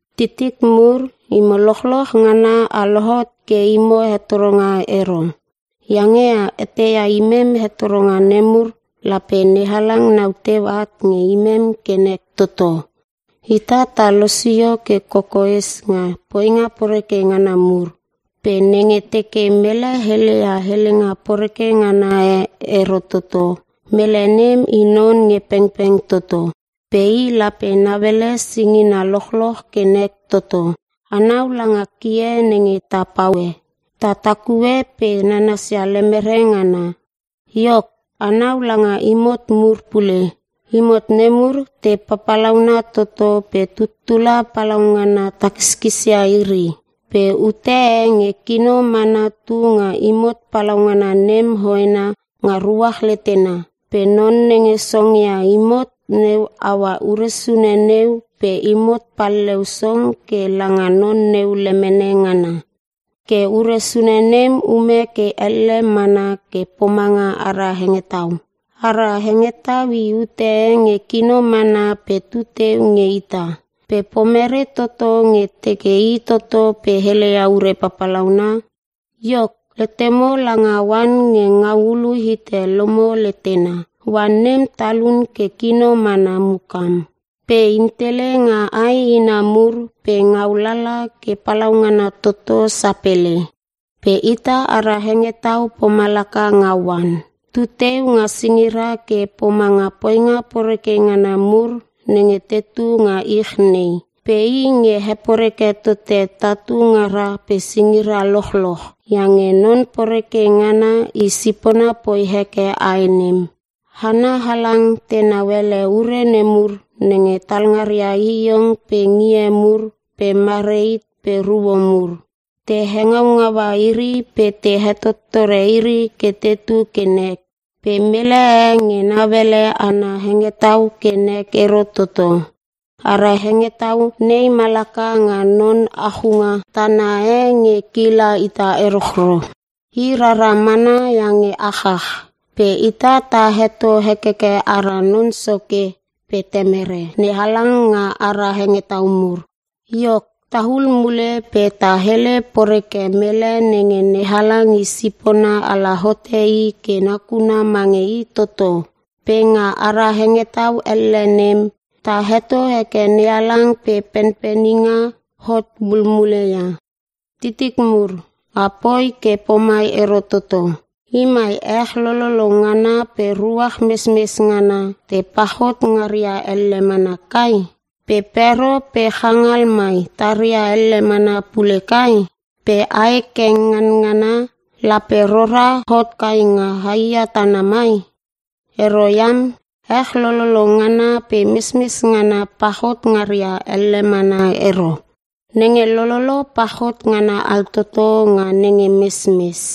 Titik mur, imo lochloch ngana a lohot ke imo hetoronga ero. Iange a eteia, imem hetoronga nemur, lape NeHalang nau teu at nge imem ke nek toto. Ita ta losio ke kokoes nga poinga poreke ngana mur. Pe nenge teke mele heleia helenga poreke ngana e ero toto, mele nem i non nge pengpeng toto. Pe i lape nauele singina lochloch ke nek toto. Anau langa kie nenge ta paue. Ta takue pe nanasia lemere ngana. Iok, anau langa imot mur pule. Imot nemur te papalauna toto pe tuttula palaungana takiskisia iri. Pe ute e nge kino mana tu nga imot palaungana nem hoena nga ruach letena. Pe non nenge songongia imot neu aua ure sune neu pe imot palleu song ke langa non neu lemene ngana. Ke ure sune nem ume ke elle mana ke pomanga ara hengetau. Ara hengetau i ute e nge kino mana pe tu teu nge ita. Pe pomere toto nge teke i toto pe heleia ure papalauna? Iok, letemo langa oan nge ngau ulu hite lomo letena. Oan nem talun ke kino mana mukam, pe intele nga ae ina mur pe ngau lala ke palaungana toto sapele. Pe ita ara hengetau pomalaka nga oan. Tu teu nga singira ke pomanga poinga poreke ngana mur nenge tetu nga ich nei. Pe i nge heporeke tote tatu ngara pe singira lochloch. Iange Non Poreke Ngana i sipona poi heke ae nem. Hana halang tenau ele ure nemur nenge talngaria hihiong pe ngie mur pe marehit pe ruo mur. Te hengau ngaua iri pe te hetottore iri ke tetu ke nek. Pe mele e nge nauele ana hengetau ke nek ero toto. Ara hengetau nei malaka nga non achunga tana e nge kila ita erochro. I rara mana iange achach. Pe ita ta heto hekeke ara Non Soke pe Temere NeHalang nga ara hengetau mur. Iok, tahul mule pe ta hele poreke mele nenge NeHalang i sipona ala hote i ke nakuna mange i toto. Pe nga ara hengetau elle nem, ta heto heke NeHalang pe penpeninga hot mulmule ia. Titik mur, a poi ke pomai ero toto. Imai ech lololo ngana pe ruach mesmes ngana, te pachot ngaria elle mana kai? Pe pero pe changal mai taria elle mana pule kai? Pe ae keng nganangana lape rora hot kai nga haiia tana mai? Ero iam! Ech lololo ngana pe mesmes ngana pachot ngaria elle mana ero. Nenge lololo, pachot ngana altoto nga nenge mesmes.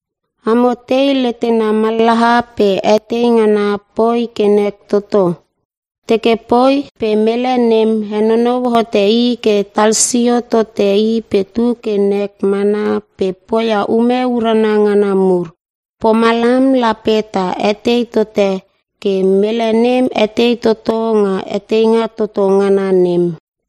Amo tei letena mallaha pe etei ngana poi ke nek toto? Teke poi pe mele nem henonou hote i ke talsio tote i pe tu ke nek mana pe poia ume urana ngana mur. Pomalam lape ta etei tote ke mele nem etei toto nga eteinga toto ngana nem.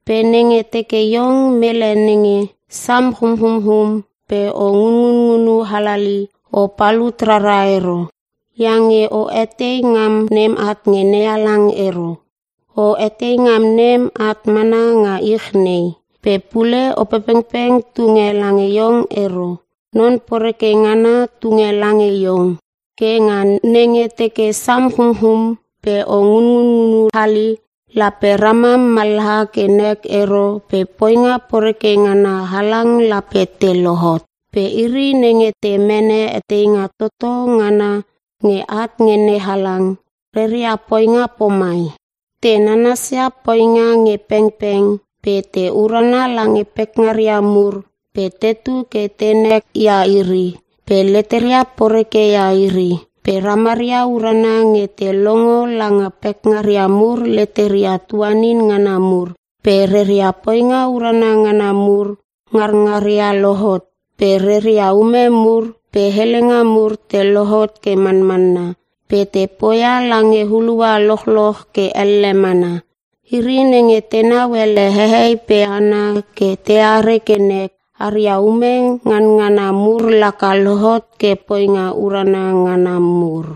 Pe nenge teke iong mele nenge sam chumchumchum pe o ngunngunu halali, o palut rara ero. Iange o etei ngam nem at nge NeHalang ero. O etei ngam nem at mana nga ich nei. Pe pule Opepengpeng tunge lange iong ero. Non poreke ngana tunge lange iong. Ke nga nenge teke sam chumchum pe o ngunngunu hali, lape ramam mallaha ke nek ero pe poinga poreke ngana halang lape te lohot. Pe iri nenge te mene eteinga toto ngana nge at nge NeHalang, reria poinga pomai: Te nanasia poinga nge pengpeng, pe te urana lange pekngaria mur, pe tetu ke tenek ia iri, pe leteria poreke ia iri. Pe ramaria urana nge te longo langa pekngaria mur leteria tuanin ngana mur, pe reria poinga urana ngana mur nganangaria lohot, pe reria ume mur pe helenga mur te lohot ke manmanna, pe te poia lange hulua lochloch ke elle mana. Iri nenge tenau ele hehei pe hana ke teare ke nek, aria ume ngana ngana mur laka lohot ke poinga urana ngana mur.